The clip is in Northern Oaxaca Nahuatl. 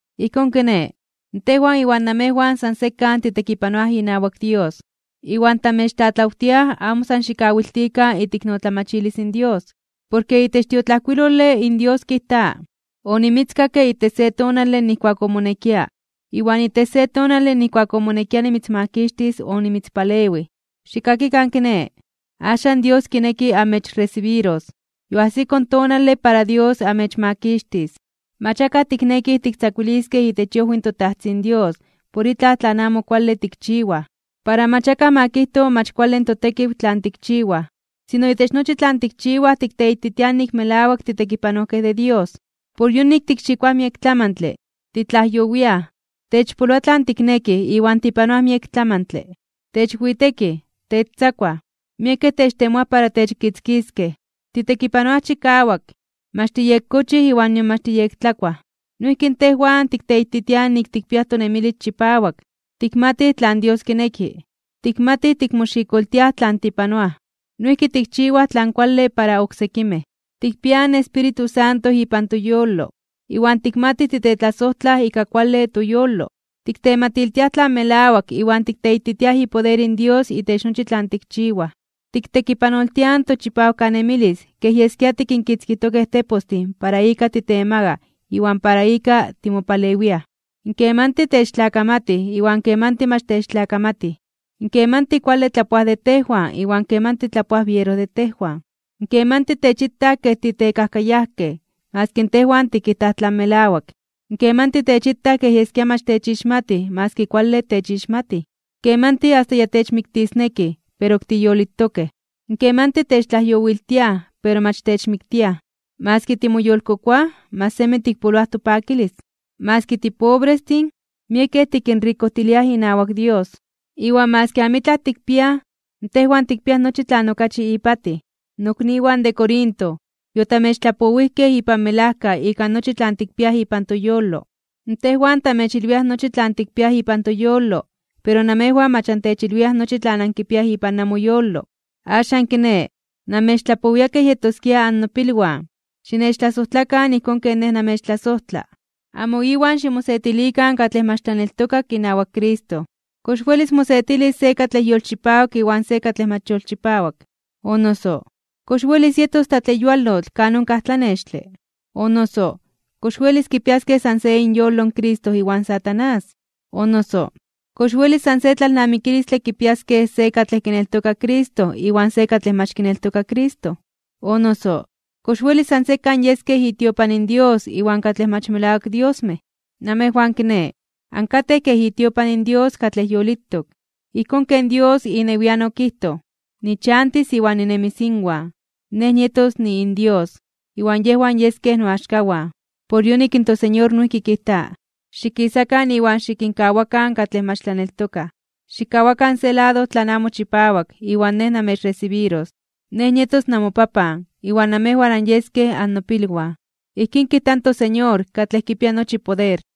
Ijkón kiné, tejwan iwan namejwan san sekan titekipanoaj inawak Dios. Iwan tamechtlatlawtiaj amo san xikawiltikan iteiknotlamachilis in Dios. Porke itech in tiotlajkuilole in Dios kijta: Onimitzkakke itech se tonale nijkuak omonekia, iwan itech se tonale nijkuak omonekia nimitzmakixtis onimitzpalewij. Xikkakikan kiné, axan Dios kineki amechresibiros. Yoajsiko in tonale para Dios amechmakixtis. Mach akaj tiknekij tiktzakuiliskej itech iojwi in toTajtzin Dios por itlaj tlan amo kuale tikchiwaj, para mach akaj ma kijto mach kuale in totekiw tlan tikchiwaj. Sino itech nochi tlan tikchiwaj tikteititiaj nik melawak titekipanojkej de Dios. Por yonik tikxikoaj miek tlamantle, titlajyowiaj, techpoloa tlan tiknekij iwan tipanoaj miek tlamantle. Techwitekij, techtzakuaj, miekej techtemoaj para techkitzkiskej. Titekipanoaj chikawak, mach tiyekkochij iwan nion mach tiyektlakuaj. Noijki tejwan tikteititiaj nik tikpiaj tonemilis chipawak, tikmatij tlan Dios kineki, tikmatij tikmoxikoltiaj tlan tipanoaj. Noijki tikchiwaj tlan kuale para oksekimej. Tikpiaj in Espíritu Santo ipan toyolo, iwan tikmatij titetlasojtlaj ika kuale toyolo. Tiktematiltiaj tlan melawak iwan tikteititiaj ipoder in Dios itech nochi tlan tikchiwaj. Tiktekipanoltiaj in tochipawkanemilis kej yeskia tikinkitzkijtokej tepostin para ika titemagaj iwan para ika timopalewiaj. Kemanti techtlakamatij iwan kemanti mach techtlakamatij. Kemanti kuale tlapoaj de tejwan iwan kemanti tlapoaj biero de tejwan. Kemanti techitaj kej titekajkayajkej maski tejwan tikijtaj tlan melawak. Kemanti techitaj kej yeskia mach techixmatij maski kuale techixmatij. Kemanti asta ya techmiktisnekij, pero ok tiyolitokej. Kemanti techtlajyowiltiaj, pero mach techmiktiaj. Maski timoyolkokoaj, mach semi tikpoloaj topakilis. Maski tipobrestin, miekej tikinrikojtiliaj inawak Dios. Iwan maski amitlaj tikpiaj, tejwan tikpiaj nochi tlan okachi ipatij. Nokniwan de Corinto, yotamechtlapowijkej ipan melajka ika nochi tlan tikpiaj ipan toyolo. Tejwan tamechilwiaj nochi tlan tikpiaj ipan toyolo, pero namejwan mach antechilwiaj nochi tlan ankipiaj ipan namoyolo. Axan kiné, namechtlapowia kej yetoskia annopilwan. Xinechtlasojtlakan ijkón ken nej namechtlasojtla. Amo iwan ximosetilikan katlej mach tlaneltokak inawak Cristo. ¿Kox welis mosetilis se katlej yolchipawak iwan se katlej mach yolchipawak? O noso, ¿kox welis yetos tlatleyualotl kan onkaj tlanextle? O noso, ¿kox welis kipiaskej san se inyolo in Cristo iwan Satanás? O noso, ¿kox welis san se tlalnamikilistle kipiaskej se katlej kineltoka in Cristo iwan se katlej mach kineltoka in Cristo? O noso, ¿kox welis san sekan yeskej itiopan in Dios iwan katlej mach melawak diosmej? Namejwan kiné, ankatej kej itiopan in Dios katlej yolitok. Ijkón ken Dios inewian okijtoj: Nichantis iwan ninemis inwan. Nej nietos niinDios, iwan yejwan yeskej noaxkawan. Por yonik in toSeñor noijki kijta: Xikisakan iwan xikinkawakan katlej mach tlaneltokaj. Xikkawakan se lado tlan amo chipawak, iwan Nej namechresibiros. Nej nietos namoPapan, iwan namejwan anyeskej annopilwan. Ijkín kijta in toSeñor katlej kipia nochi poder.